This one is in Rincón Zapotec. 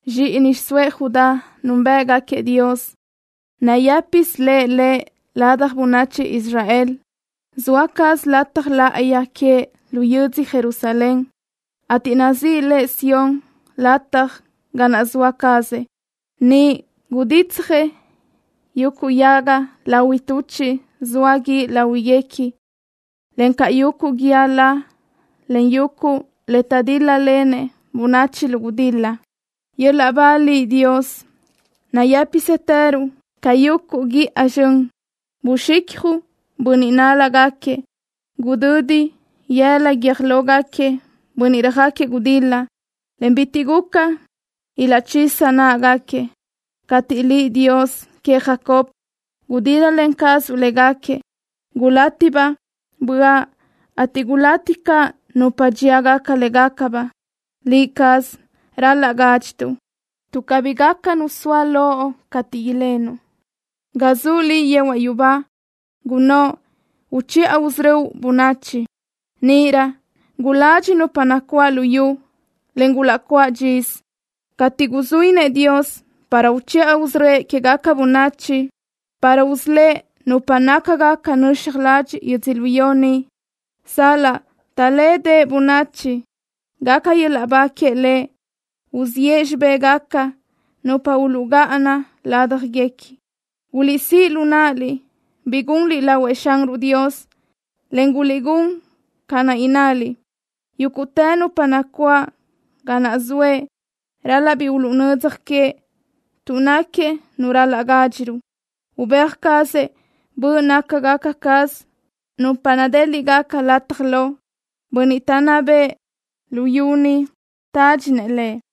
Zxíʼini xiʼsóëʼ Judá núnbëʼgaquiëʼ Dios. Nayë́pisë le lëʼ ladaj bönachi Israel. Zoa caz lataj láʼayi queëʼ lu yödzö Jerusalen, ateʼ nazíʼi le Sión lataj ga naʼ zoa cazëʼ. Niʼ guditsjëʼ yuguʼ yaga lahui tuchiʼ zoa guíʼ láhuiguequi, encaʼ yuguʼ guíë la, en yuguʼ le taʼdíl-lalen bönachi lu gudil-la. ¡Yöl-laʼ ba Liʼ, Dios! ¡Nayë́pisëtëruʼ ca yuguʼ guíʼa zxön! Buxicjuʼ bönniʼ nál-lagaquiëʼ. Gudödi yëla guiö́j lógaquiëʼ bönniʼ röjáquiëʼ gudil-la, en bitiʼ guca ilaʼchisa náʼagaquiëʼ. Cateʼ Liʼ, Dios queëʼ Jacob, gudíl-lalen cazuʼ légaquiëʼ gulátibaʼ böaʼ, ateʼ gulati caʼ nupa dxíagaca légacabaʼ. Liʼ caz ral-laʼ gádxituʼ, tuʼ cabí gaca nu soa loʼ cateʼ ilenuʼ. Ga zuʼ Liʼ yehuaʼ yubá gunnóʼ uchiʼa usörö́uʼ bönachi. Níʼirö guladxi nupa nacuáʼ lu yu, en gulaʼcuáʼ dxisö, cateʼ guzuínëʼ Dios para uchiʼa usörö́ëʼ quégaca bönachi, para usölë́ʼ nupa nácagaca nöxaj ladxiʼ yödzölió ni. Sal-laʼ taʼlédeʼe bönachi, gaca yöl-laʼ ba queëʼ Lëʼ. Uziʼë xibégaca nupa uluʼgáʼana ládjaguequi. Guliʼsíʼ lu náʼaliʼ bi gunliʼ lahuëʼ Xanruʼ Dios, en guliʼgún ca naʼ innaliʼ. Yúguʼtë nupa nacuáʼ ga naʼ zoëʼ ral-laʼ bi uluʼnödzaj queëʼ, tuʼ náquiëʼ Nu ral-laʼ gádxiruʼ. Ubéaj cazëʼ böʼ nácagaca caz nupa nadéliʼgaca lataj lo. Bönniʼ taʼnná bëʼë luyú ni tádxinëʼ Lëʼ.